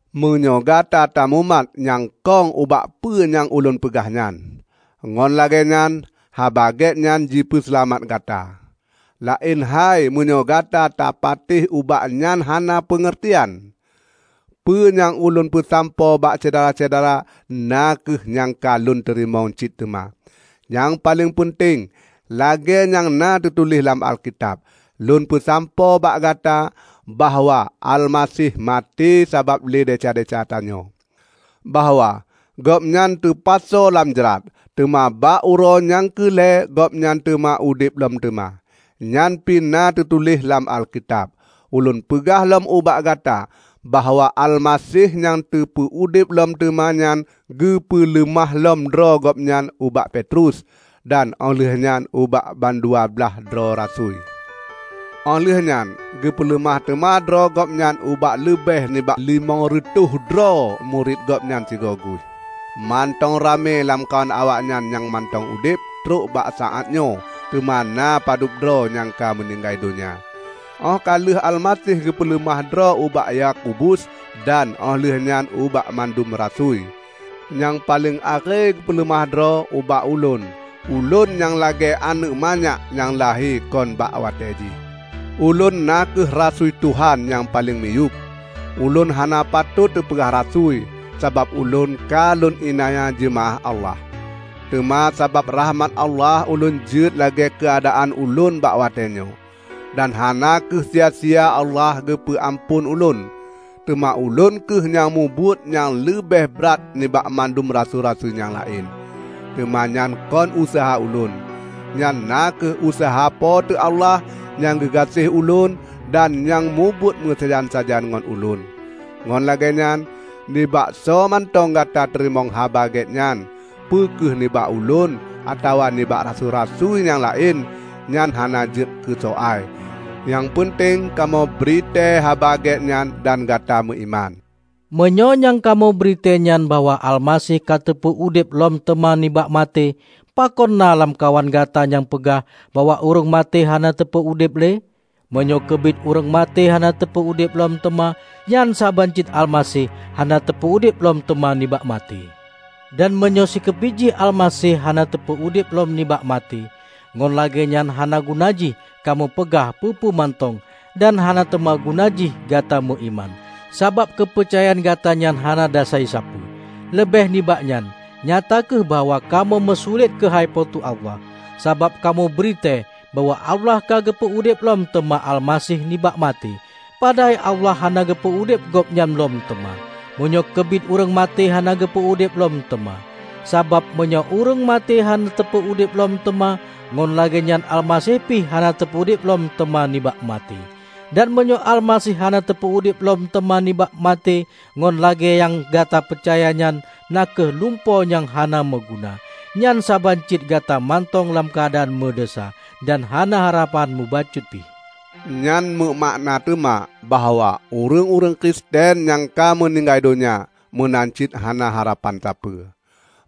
Meunyoe gata tamumat nyang kong ubak peue nyang ulôn peugah nyan, ngon lagée nyan Haba Gét nyan jipeuseulamat gata; laén hai meunyoe Gata tapatéh ubak nyan hana peungeurtian. Peue nyang ulôn peusampoe bak Syedara-syedara na kheueh nyang ka lôn teurimong cit teuma. Nyang paleng peunteng, lagée nyang na teutuléh lam Alkitab, lôn peusampoe bak gata bahwa Almaseh maté sabab lé desya-desya tanyoe; bahwa Gobnyan teupasoe lam jrat, teuma bak uroe nyang keu lhée Gobnyan teupeu udeb lom teuma. Nyan pi na teutuléh lam Alkitab. Ulôn peugah lom ubak gata bahwa Almaseh nyang teupeu-udeb lom teuma nyan geupeuleumah lom droe Gobnyan ubak Petrus, dan óh lheueh nyan ubak bandua blaih droe rasui. Óh lheueh nyan geupeuleumah teuma droe Gobnyan ubak leubeh nibak limong reutôh droe murit Gobnyan sigoe guih. Mantong ramé lamkawan awaknyan nyang mantong udeb trok bak saát nyoe, teuma na padub droe nyang ka meuninggai donya. Óh ka lheueh Almaseh geupeuleumah droe ubak Yakobus dan óh lheueh nyan ubak mandum rasui. Nyang paleng akhé geupeuleumah droe ubak ulôn -- ulôn nyang lagée aneuëk manyak nyang lahé kon bak watée jih! Ulôn na kheueh rasui Tuhan nyang paleng miyueb. Ulôn hana patot teupeugah rasui, sabab ulôn ka lôn iénanya jeumaáh Allah. Teuma sabab rakhmat Allah ulôn jeuet lagée keuadaan ulôn bak watée nyoe. Dan hana kheueh sia-sia Allah geupeue amphon ulôn. Teuma ulôn kheueh nyang mubuet nyang leubeh brat nibak mandum rasui-rasui nyang laén. Teuma nyan kon useuha ulôn; nyan na kheueh useuha Po teu Allah nyang geugaséh ulôn dan nyang mubuet meusajan-sajan ngon ulôn. Ngon lagée nyan, nibak soemantong gata teurimong Haba Gét nyan -- peu kheueh nibak ulôn atawa nibak rasui-rasui nyang laén -- nyan hana jeuet keusoai. Nyang peunteng kamoe bri tée Haba Gét nyan dan Gata meuiman. Meunyoe nyang kamoe bri tée nyan bahwa Almaseh ka teupeu udeb lom teuma nibak maté, pakon na lamkawan gata nyang peugah bahwa ureuëng maté hana teupeue udeb le? Meunyoe keubiet ureuëng maté hana teupeu udeb lom teuma, nyan saban cit Almaseh hana teupeu udeb lom teuma nibak maté. Dan meunyoe sikeubiet jih Almaseh hana teupeu udeb lom nibak maté, ngon lagée nyan hana guna jih kamoe peugah peue-peue mantong dan hana teuma guna jih gata meuiman, sabab keupeucayaan gata nyan hana dasai sapeue. Leubeh nibak nyan, nyata kheueh bahwa kamoe meusulet keuhai Po teu Allah, sabab kamoe bri tée bahwa Allah ka geupeu udeb lom teuma Almaseh nibak maté, padahai Allah hana geupeu udeb Gobnyan lom teuma -- meunyoe keubiet ureuëng maté hana geupeu udeb lom teuma! Sabab meunyoe ureuëng maté hana teupeu udeb lom teuma, ngon lagée nyan Almaseh pih hana teupeu udeb lom teuma nibak maté. Dan meunyoe Almaseh hana teupeu udeb lom teuma nibak maté ngon lagée nyang gata peucaya nyan na kheueh lumpo nyang hana meuguna; nyan saban cit gata mantong lam keuadaan meudesya dan hana harapan mubacut pi. Nyan meumakna teuma bahwa ureuëng-ureuëng Kristen nyang ka meuninggai donya, meunan cit hana harapan sapeue.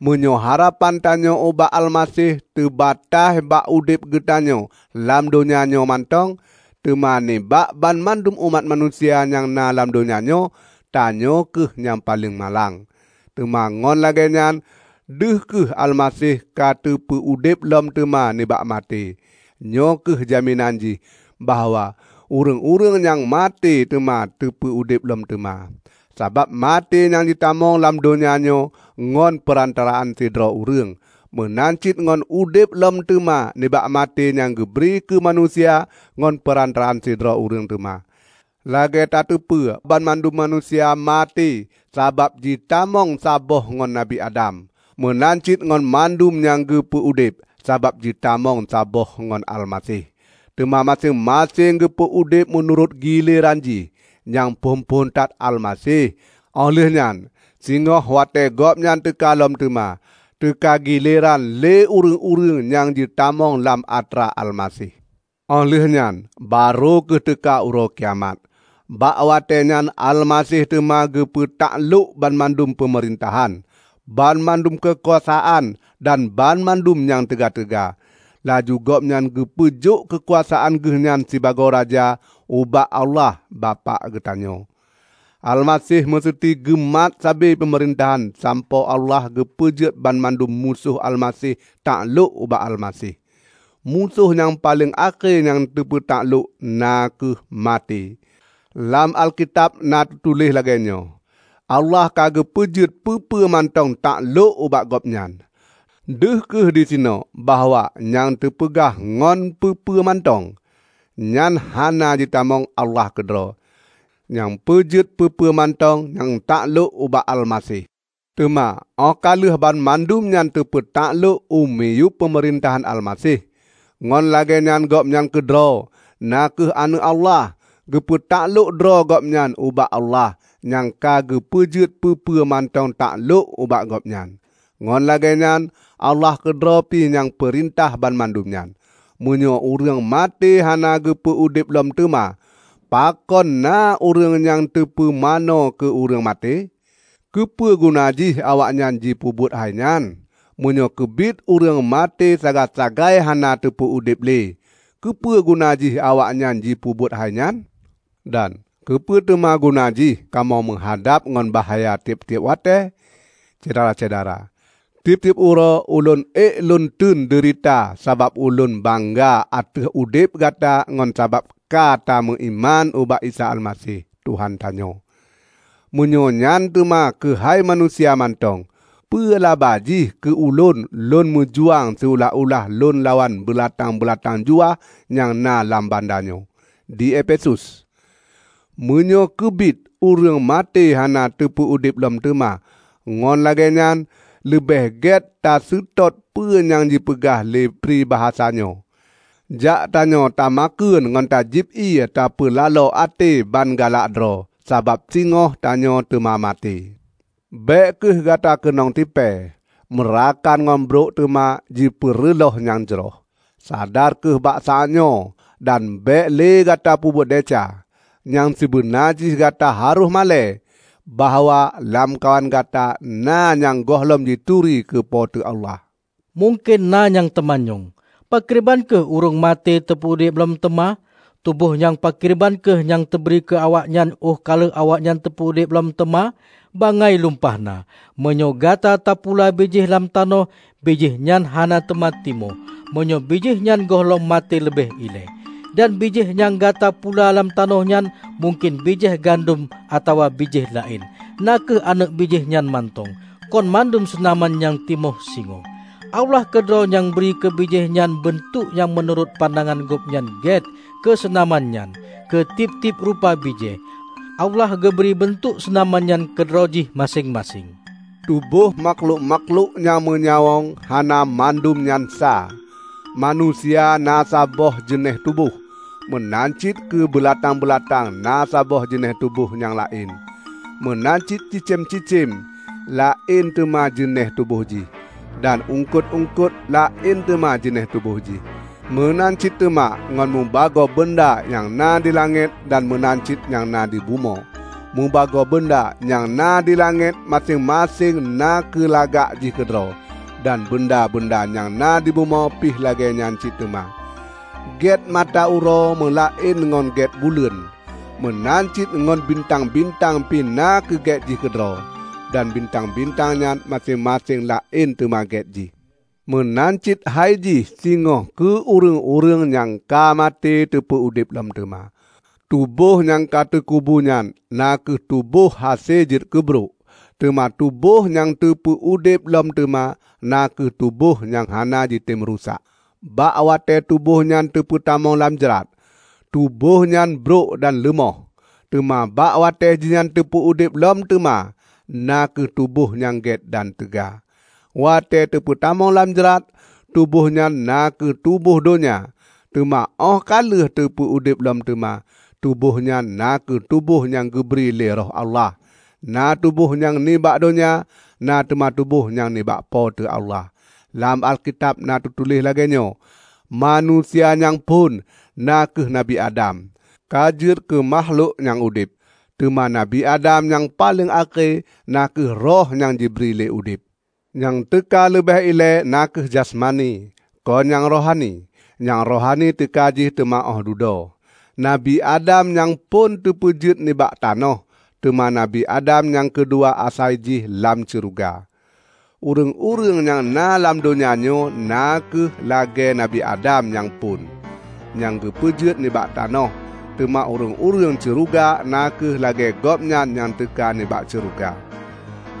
Meunyoe harapan tanyoe ubak Almaseh teubataih bak udeb geutanyoe lam donya nyoe mantong, teuma nibak banmandum umat manusia nyang na lam donya nyoe, tanyoe kheueh nyang paleng malang! Teuma ngon lagée nyan deuh kheueh Almaseh ka teupeu udeb lom teuma nibak maté. Nyoe kheueh jaminan jih bahwa ureuëng-ureuëng nyang ka maté teuma teupeu udeb lom teuma. Sabab maté nyang jitamong lam donya nyoe ngon peurantaraan sidroe ureuëng, meunan cit ngon udeb lom teuma nibak maté nyang geubri keu manusia ngon peurantaraan sidroe ureuëng teuma. Lagée tateupeue banmandum manusia maté sabab jitamong saboh ngon Nabi Adam, meunan cit ngon mandum nyang geupeu udeb, sabab jitamong saboh ngon Almaseh. Teuma maséng-maséng geupeu udeb meunurot gileran jih: nyang phon-phon that Almaseh; óh lheueh nyan singoh watée Gobnyan teuka lom teuma, teuka gileran lé ureuëng-ureuëng nyang jitamong lam atra Almaseh. Óh lheueh nyan barô kheueh teuka uroe kiamat. Bak watée nyan Almaseh teuma geupeu taklôk banmandum peumeurintahan, banmandum keukuasaan dan banmandum nyang teuga-teuga; laju Gobnyan geupeujok keukuasaan geuhnyan sibagoe Raja, ubak Allah, Bapak geutanyoe. Almaseh meuseuti geumat sabe peumeurintah sampoe Allah geupeujeuet banmandum musoh Almaseh taklôk ubak Almaseh. Musoh nyang paleng akhé nyang teuma geupeu taklôk na kheueh maté. Lam Alkitab na teutuléh lagée nyoe, "Allah ka geupeujeuet peue-peue mantong taklôk ubak Gobnyan." Deuh kheueh disinoe bahwa nyang teupeugah ngon "peue-peue mantong" nyan hana jitamong Allah keudroe, nyang peujeuet peue-peue mantong nyan taklôk ubak Almaseh. Teuma óh ka lheueh banmandum nyan teupeutaklok u miyueb peumeurintahan Almaseh, ngon lagée nyan Gobnyan keudroe, na kheueh Aneuëk Allah, geupeu taklôk droe Gobnyan ubak Allah nyang ka geupeujeuet peue-peue mantong taklôk ubak Gobnyan. Ngon lagée nyan Allah keudroe pi nyang peurintah banmandum nyan. Meunyoe ureuëng maté hana geupeu udeb lom teuma, pakon na ureuëng nyang teupumanö keu ureuëng maté? Keupeue guna jih awaknyan jipeubuet hai nyan? Meunyoe keubiet ureuëng maté sagai-sagai hana teupeu udeb le, keupeue guna jih awaknyan jipeubuet hai nyan? Dan keupeue teuma guna jih kamoe meuhadab ngon bahya tieb-tieb watée? Syedara-syedara! Tieb-tieb uroe ulôn ék lôn teun deurita sabab ulôn bangga ateueh udeb gata ngon sabab ka tameuiman ubak Isa Almaseh, Tuhan tanyoe. Meunyoe nyan teuma keuhai manusia mantong, peue laba jih keu ulôn lôn meujuang siulah-ulah lôn lawan beulatang-beulatang juah nyang na lam banda nyoe, di Efesus? Meunyoe keubiet ureuëng maté hana teupeu udeb lom teuma, ngon lagée nyan, leubeh gét taseutôt peue nyang jipeugah lé pribasa nyoe: "Jak tanyoe tamakheun ngon tajieb ié tapeulalo até ban galak droe, sabab singoh tanyoe teuma maté." Bék kheueh gata keunong tipée! Meurakan ngon brok teuma jipeureulôh nyang jroh. Sadar kheueh bak saát nyoe, dan bék le gata peubuet desya. Nyang sibeuna jih gata harôh malée, bahwa lamkawan gata na nyang gohlom jituri keu Po teu Allah. Mungken na nyang teumanyong, "Pakriban kheueh ureuëng maté teupeu udeb lom teuma? Tuboh nyang pakriban kheueh nyang teubri keu awaknyan, óh ka lheueh awaknyan teupeu udeb lom teuma?" Bangai lumpah na! Meunyoe Gata tapula bijéh lam tanoh, bijéh nyan hana teuma timoh, meunyoe bijéh nyan gohlom maté leubeh ilée. Dan bijéh nyang Gata pula lam tanoh nyan -- mungken bijéh gandom atawa bijéh laén -- na kheueh aneuëk bijéh nyan mantong, kon mandum seunaman nyang timoh singoh. Allah keudroe nyang bri keu bijéh nyan beuntuek nyang meunurot pandangan Gobnyan gét keu seunaman nyan. Keu tieb-tieb rupa bijéh, Allah geubri beuntuek seunaman nyan keudroe jih maséng-maséng. Tubôh makhlok-makhlok nyang meunyawöng hana mandum nyan sa. Manusia na saboh jeunéh tuboh, meunan cit keu beulatang-beulatang na saboh jeunéh tuboh nyang laén; meunan cit cicém-cicém laén teuma jeunéh tuboh jih, dan eungkot-eungkot laén teuma jeunéh tuboh jih. Meunan cit teuma ngon mubagoe beunda nyang na dilangét dan meunan cit nyang na dibumoe. Mubagoe beunda nyang na dilangét maséng-maséng na keulagak jih keudroe, dan beunda-beunda nyang na dibumoe pih lagée nyan cit teuma. Gét mata uroe meulaén ngon gét buleuen. Meunan cit ngon bintang-bintang pi na keugét jih keudroe. Dan bintang-bintang nyan maséng-maséng laén teuma gét jih. Meunan cit hai jih singoh keu ureuëng-ureuëng nyang ka maté teupeu udeb lom teuma. Tuboh nyang ka teukubu nyan na kheueh tuboh hase jeuet keu brok, teuma tuboh nyang teupeu udeb lom teuma, na kheueh tuboh nyang hana jitem rusak. Bak watée tuboh nyan teupeutamong lam jrat, tuboh nyan brok dan leumoh; teuma bak watée jihnyan teupeu udeb lom teuma, na kheueh tuboh nyang gét dan teuga. Watée teupeutamong lam jrat, tuboh nyan na kheueh tuboh donya; teuma óh ka lheueh teupeu udeb lom teuma, tuboh nyan na kheueh tuboh nyang geubri lé Roh Allah. Na tuboh nyang nibak donya, na teuma tuboh nyang nibak Po teu Allah. Lam Alkitab na teutuléh lagée nyoe, "Manusia nyang phon, na kheueh Nabi Adam, ka jeuet keu makhlok nyang udeb," teuma Nabi Adam nyang paleng akhé na kheueh Roh nyang jibri udeb. Nyang teuka leubeh ilée na kheueh jasmani, kon nyang rohani. Nyang rohani teuka jih teuma óh dudoe. Nabi Adam nyang phon teupeujeuet nibak tanoh, teuma Nabi Adam nyang keudua asai jih lam syeuruga. Ureuëng-ureuëng nyang na lam donya nyoe na kheueh lagée Nabi Adam nyang phon, nyang geupeujeuet nibak tanoh, teuma ureuëng-ureuëng syeuruga na kheueh lagée Gobnyan nyang teuka nibak syeuruga.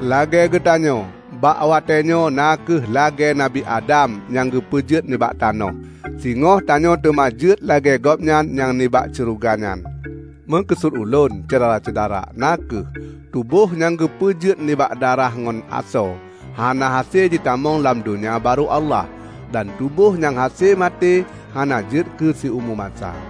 Lagée geutanyoe bak watée nyoe na kheueh lagée Nabi Adam nyang geupeujeuet nibak tanoh, singoh tanyoe teuma jeuet lagée Gobnyan nyang nibak syeuruga nyan. Meukeusut ulôn, Syedara-syedara, na kheueh: tuboh nyang geupeujeuet nibak darah ngon asoe, hana hase jitamong lam Donya Barô Allah; dan tuboh nyang hase maté hana jeuet keu siumu masa.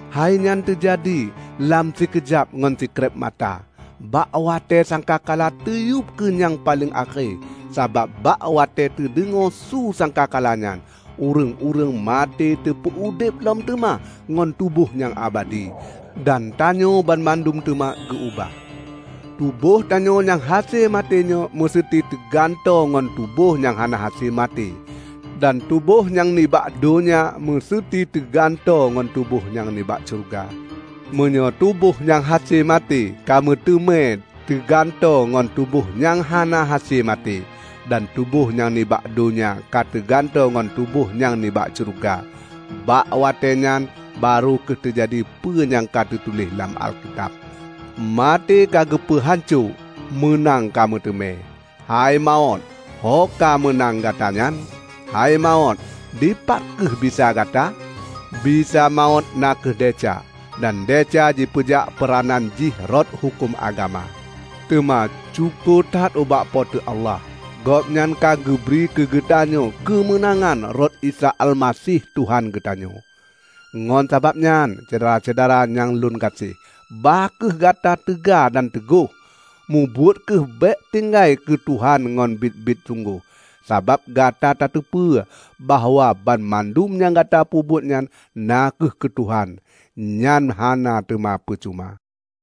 Hainyan teujadi lam sikeujab ngon sikrék mata, bak watée sangka kala teuyueb keu nyang paleng akhé. Sabab bak watée teudeungoe su sangka kala nyan, ureuëng-ureuëng maté teupeu udeb lom teuma ngon tuboh nyang abadi, dan tanyoe banmandum teuma geu-ubah. Tuboh tanyoe nyang hase maté nyoe meuseuti teugantoe ngon tuboh nyang hana hase maté, dan tuboh nyang nibak donya meuseuti teugantoe ngon tuboh nyang nibak syeuruga. Meunyoe tuboh nyang hase maté ka meuteumé teugantoe ngon tuboh nyang hana hase maté, dan tuboh nyang nibak donya ka teugantoe ngon tuboh nyang nibak syeuruga, bak watée nyan barô kheueh teujadi peue nyang ka teutuléh lam Alkitab, "Maté ka geupeu hanco; meunang ka meuteumé!" "Hei mawöt, hoka meunang gata nyan? Hei mawöt, dipat kheueh bisa gata?" Bisa mawöt na kheueh desya, dan desya jipeujak peuranan jih rot huköm agama. Teuma syukoe that ubak Po teu Allah; Gobnyan ka geubri keugeutanyoe keumeunangan rot Isa Almaseh Tuhan geutanyoe! Ngon sabab nyan, Syedara-syedara nyang lon gaséh, bah kheueh gata teuga dan teugoh. Mubuet kheueh bék tinggai keu Tuhan ngon biet-biet sunggoh, sabab gata tateupeue bahwa banmandum nyang gata peubuet nyan na kheueh keu Tuhan, nyan hana teuma peucuma.